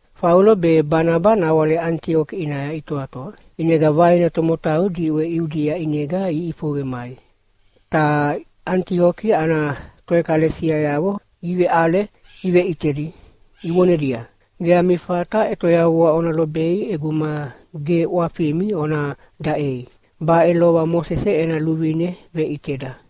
Faulo be Banaba nawale Anitioki ʼinaya itoatoa, ʼinega vaina tomotau diʼwe Iudia ʼinega iʼifoqe imai, ta Anitioki ana toʼekalesiayavo iveʼale iveʼitedi ivonedia, “Ge ami fata ʼetoyavua ona lobei ʼeguma ge ʼwafimi ona daʼei. Baʼe lova Mosese ena luvine veʼiteda!”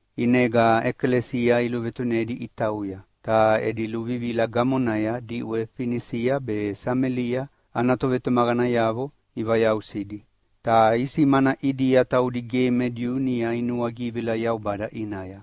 ʼInega ʼekalesia iluvetunedi itauya, ta edi luvivila gamonaya diʼwe Finisia be Samelia ana tovetumaqanayavo ivayausidi. Ta isimana ʼidia taudi ge me Diu niʼa inuagivila Yaubada ʼinaya.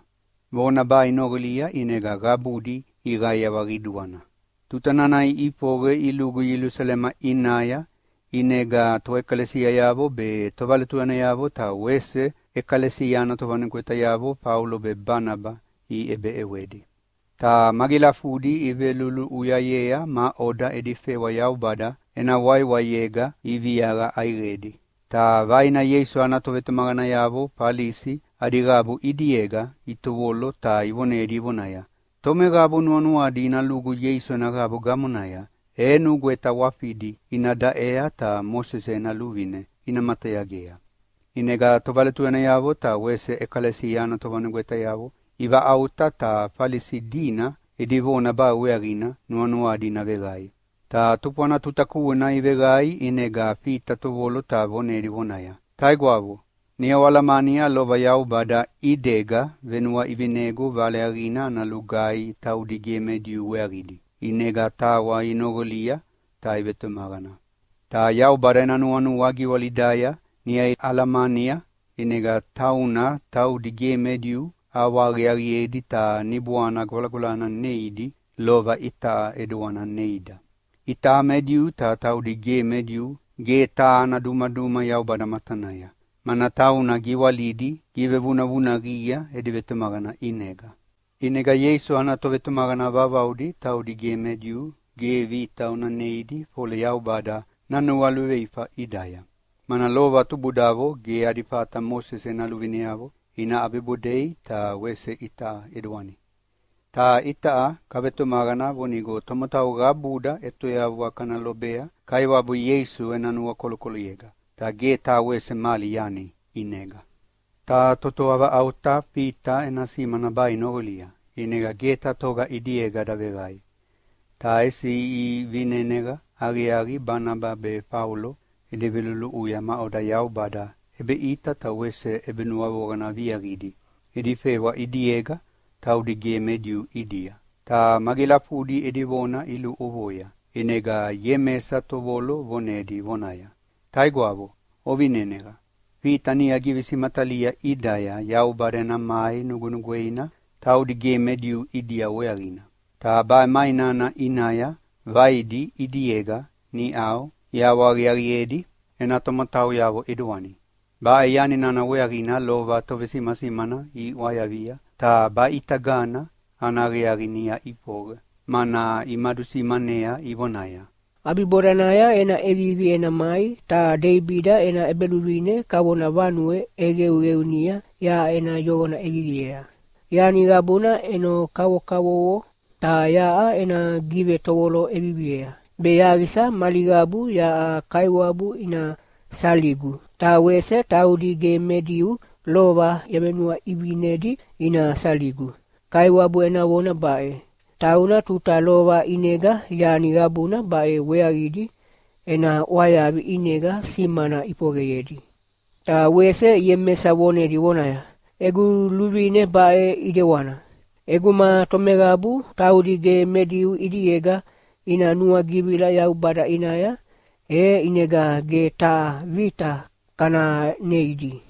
Vona baʼe inoqolia, ʼinega qabudi iqaiawa qiduana. Tuta nana iʼifoqe ilugu Ielusalema ʼinaya, ʼinega toʼekalesiayavo be tovaletuyanayavo ta wese ʼekalesia ana tovanugwetayavo Faulo be Banaba iʼebeʼewedi. Ta magilafudi iveluluʼuyayea maʼoda edi fewa Yaubada ena waiwaiega iviaqa ʼaiqedi. Ta vaina Ieisu ana tovetumaqanayavo Falisi adi qabu ʼidiega itovolo ta ivonedi ivonaya, “Tomeqabu nuanuadi ina lugu Ieisu ena qabu gamonaya e nugweta ʼwafidi ina daʼea ta Mosese ena luvine ina matayagea.” ʼInega tovaletuyanayavo ta wese ʼekalesia ana tovanugwetayavo ivaʼauta ta Falisi dina edi vona baʼe weaqina nuanuadi ina veqae. Ta tufwana tuta kuena iveqae ʼinega Fita tovolo ta vonedi vonaya, “Taigwavo, niʼa oalamania lova Yaubada ʼidega venuaʼivinegu Vale Aqiaqina ana lugaihi taudi ge me Diu weaqidi, ʼinega tawa inoqolia ta ivetumaqana. Ta Yaubada eda nuanua giwalidaya niʼa alamania, ʼinega tauna taudi ge me Diu ʼawahaqiaqiedi ta Niboana Gwalagwalana neidi lova itaʼa ʼidewana neida. Itaʼa me Diu ta taudi ge me Diu ge taha ana dumaduma Yaubada matanaya, mana tauna giwalidi givevunavunaqia edi vetumaqana ʼinega. ʼInega Ieisu ana tovetumaqana vauvaudi taudi ge me Diu ge vita ona neidi fole Yaubada nanualuveifa ʼidaya. Mana lova tubudavo ge adi fata Mosese ena luvineavo ina ʼabibodei ta wese itaʼa ʼidewana. Ta itaʼa kavetumaqana vonigo tomotau qabuda ʼetoyavua kana lobea Kaiwabu Ieisu ena nuakolokoloyega, ta ge taha wese mali yani ʼinega.” Ta totoa vaʼauta Fita ena simana baʼe inoqolia, ʼinega ge taha toga ʼidiega daveqae, ta ʼesi ivineneqa aqiaqi Banaba be Faulo edi veluluʼuya maʼoda Yaubada ʼebeʼita ta wese ʼebenuavoqana viaqidi edi fewa ʼidiega taudi ge me Diu ʼidia. Ta magilafudi edi vona iluʼovoia, ʼinega Iemesa tovolo vonedi vonaya, “Taigwavo, ovineneqa! Fita niʼa givesimatalia ʼidaya Yaubada ena mai nugwenugweina taudi ge me Diu ʼidia weaqina. Ta baʼe mai nana ʼinaya vaidi ʼidiega niʼau ʼawahaqiaqiedi ena tomotauyavo ʼidewani. Baʼe yani nana weaqina lova tovesimasimana iʼwayavia, ta baʼitagana ana aqiaqi niʼa ʼifoqe, mana imadusimanea ivonaya, ‘ʼAbibodanaya ena ʼevivi ena mai ta Deibida ena ʼebeluvine kavona vanue ʼeqeuqeunia yaʼa ena yoqona ʼeviviea. Yani qabuna ʼeno kavokavovo, ta yaʼa ena givetovolo ʼeviviea, be yaqisa mali qabu yaʼa Kaiwabu ina saligu. Ta wese taudi ge me Diu lova yavenuaʼivinedi ina saligu. Kaiwabu ena vona baʼe, tauna tuta lova ʼinega yani qabuna baʼe weaqidi ena ʼwayavi ʼinega simana ʼifoqeyedi.’” Ta wese Iemesa vonedi vonaya, “Egu luvine baʼe ʼidewana: ʼEguma tomeqabu taudi ge me Diu ʼidiega ina nuagivila Yaubada ʼinaya, e ʼinega ge taha vita kana neidi.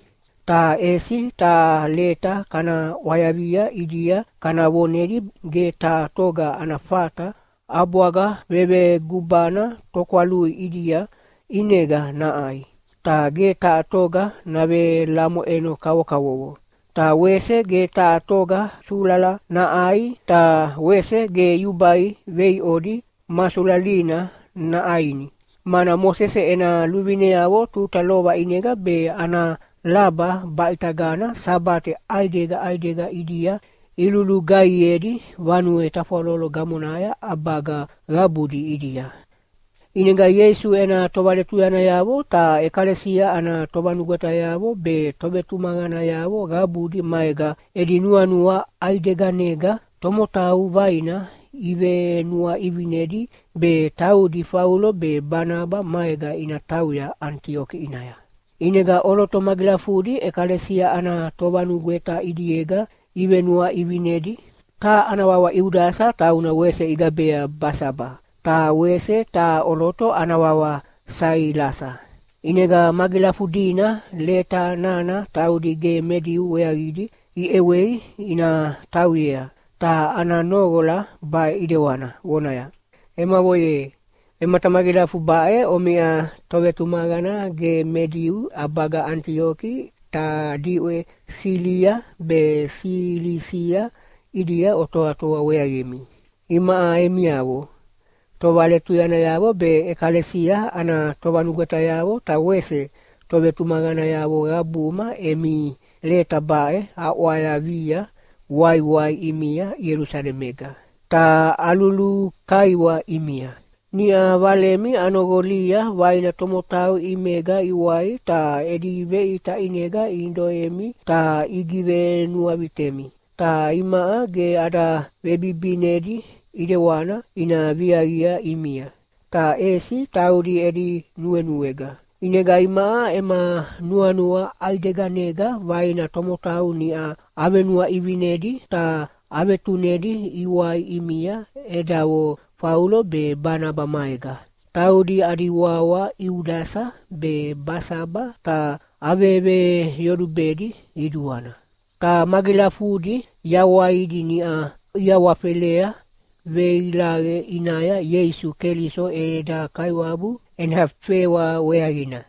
Ta ʼesi taha leta kana ʼwayavia ʼidia kana vonedi ge taha toga ana fata ʼabwaga vevegubana tokwalui ʼidia ʼinega naʼai, ta ge taha toga navelamoʼeno kavokavovo, ta wese ge taha toga sulala naʼai ta wese ge yubai veiʼodi ma sulalina naʼaini. Mana Mosese ena luvineavo tuta lova ʼinega be ana laba baʼitagana Sabate ʼaidega ʼaidega ʼidia ilulugaihiedi vanue tafwalolo gamonaya ʼabaga qabudi ʼidia.” ʼInega Ieisu ena tovaletuyanayavo ta ʼekalesia ana tovanugwetayavo be tovetumaqanayavo qabudi maega edi nuanua ʼaideganega tomotau vaina ivenuaʼivinedi be taudi Faulo be Banaba maega ina tauya Anitioki ʼinaya. ʼInega ʼoloto magilafudi ʼekalesia ana tovanugweta ʼidiega ivenuaʼivinedi. Taha ana wawa Iudasa tauna wese igabea Basaba, ta wese taha ʼoloto ana wawa Sailasa. ʼInega magilafudina leta nana taudi ge me Diu weaqidi iʼewei ina tauyea, ta ana noqola baʼe ʼidewana vonaya, “Emavo ye, Vematamagilafu baʼe omiʼa tovetumaqana ge me Diu ʼabaga Anitioki ta diʼwe Silia be Silisia ʼidia otoatoa weaqimi. Imaʼa emiavo tovaletuyanayavo be ʼekalesia ana tovanugwetayavo ta wese tovetumaqanayavo qabuma emi leta baʼe aʼwayavia waiwai ʼimia Ielusalemega, ta alulukaiwa ʼimia. Niʼa valemi anoqolia vaina tomotau ʼimega iwai ta edi veʼita ʼinega inidoemi ta igivenuavitemi. Ta imaʼa ge ada vebibinedi ʼidewana ina viaqi ʼimia, ta ʼesi taudi edi nuenuega. ʼInega imaʼa ema nuanua ʼaideganega vaina tomotau niʼa avenuaʼivinedi ta avetunedi iwai ʼimia edavo Faulo be Banaba maega, taudi adi wawa Iudasa be Basaba ta aveveyolubedi qiduana. Ta magilafudi yawaidi niʼa iawafelea veilaqe ʼinaya Ieisu Keliso eda Kaiwabu ena fewa weaqina.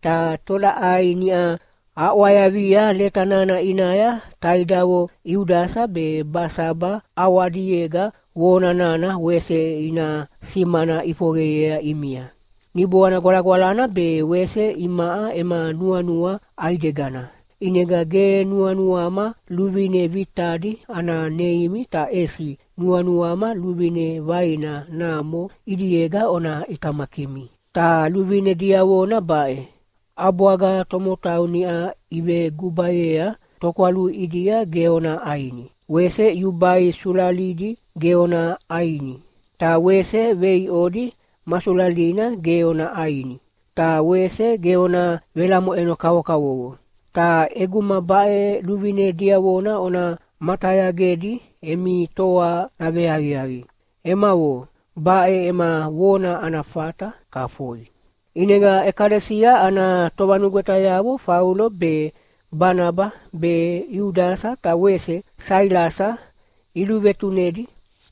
Ta tolaʼai niʼa aʼwayavia leta nana ʼinaya taidavo Iudasa be Basaba ʼawadiega vona nana wese ina simana ʼifoqeyea ʼimia. Niboana Gwalagwalana be wese imaʼa ema nuanua ʼaidegana, ʼinega ge nuanuama luvine vitadi ana neimi ta ʼesi nuanuama luvine vaina namo ʼidiega ona ʼitamakimi. Ta luvine diavona baʼe: ʼAbwaga tomotau niʼa ivegubayea tokwalui ʼidia ge ona ʼaini. Wese yubai sulalidi ge ona ʼaini, ta wese veiʼodi ma sulalina ge ona ʼaini. Ta wese ge ona velamoʼeno kavokavovo. Ta ʼeguma baʼe luvine diavona ona matayagedi emi toa naveaqiaqi. Emavo, baʼe ema vona ana fata. Kafoi.” ʼInega ʼekalesia ana tovanugwetayavo Faulo be, Banaba be, Iudasa ta wese Sailasa iluvetunedi,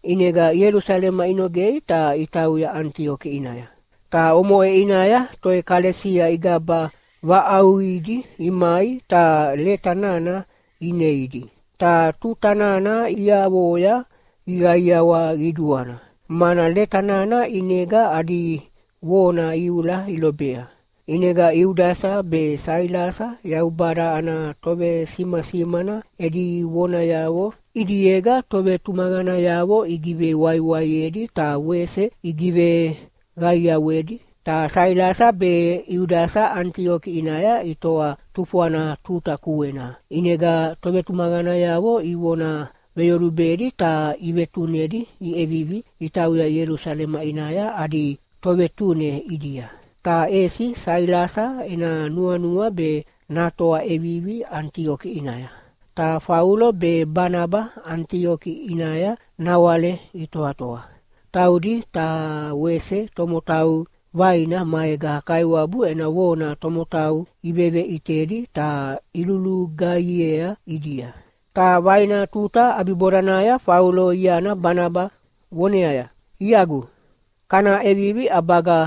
ʼinega Ielusalema inogei ta itauya Anitioki ʼinaya. Ta omoʼe ʼinaya toʼekalesia igaba vaʼauqidi imai ta leta nana ineidi. Ta tuta nana iavoya iqaiawa qiduana, mana leta nana ʼinega adi vona iula ilobea. ʼInega Iudasa be Sailasa Yaubada ana tovesimasimana edi vonayavo ʼidiega tovetumaqanayavo igivewaiwaiedi ta wese igiveqaiawedi. Ta Sailasa be Iudasa Anitioki ʼinaya itoa tufwana tuta kuena, ʼinega tovetumaqanayavo ivona veyolubedi ta ivetunedi iʼevivi itauya Ielusalema ʼinaya adi tovetune ʼidia. [ Ta ʼesi Sailasa ena nuanua be natoa ʼevivi Anitioki ʼinaya.] Ta Faulo be Banaba Anitioki ʼinaya nawale itoatoa. Taudi ta wese tomotau vaina maega Kaiwabu ena vona tomotau iveveʼitedi ta ilulugaihiea ʼidia. Ta vaina tuta ʼabibodanaya Faulo iana Banaba voneaya, “Iagu, kana ʼevivi ʼabaga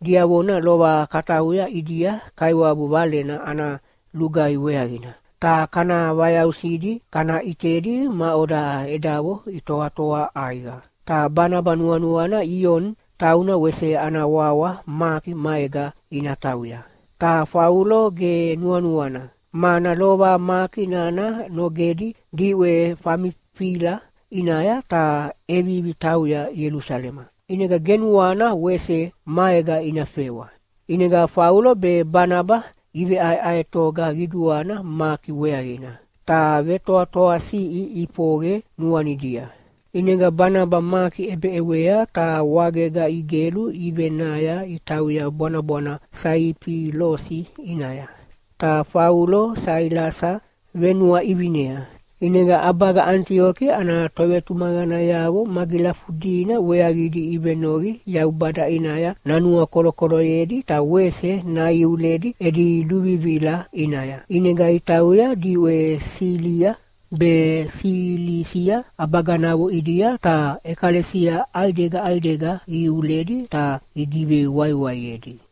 diavona lova katauya ʼidia Kaiwabu Valena ana lugaihi weaqina, ta kana vayausidi kana ʼitedi maʼoda edavo itoatoa ʼaiqa.” Ta Banaba nuanuana Ioni tauna wese ana wawa Maki maega ina tauya. Ta Faulo ge nuanuana, mana lova Maki nana nogedi diʼwe Famifila ʼinaya ta ʼevivi tauya Ielusalema. ʼInega ge nuana wese maega ina fewa. ʼInega Faulo be Banaba iveʼaeʼaetoga qiduana Maki weaqina, ta vetoatoasiʼi ʼifoqe nuanidia. ʼInega Banaba Maki ʼebeʼewea ta wagega igelu ivenaya itauya bwanabwana Saifilosi ʼinaya. Ta Faulo Sailasa venuaʼivinea. ʼInega ʼabaga Anitioki ana tovetumaqanayavo magilafudina weaqidi ivenoqi Yaubada ʼinaya nanuakolokoloyedi ta wese naiuledi edi luvivila ʼinaya. ʼInega itauya diʼwe Silia be Silisia ʼabaganavo ʼidia ta ʼekalesia ʼaidega ʼaidega iuledi ta igivewaiwaiedi.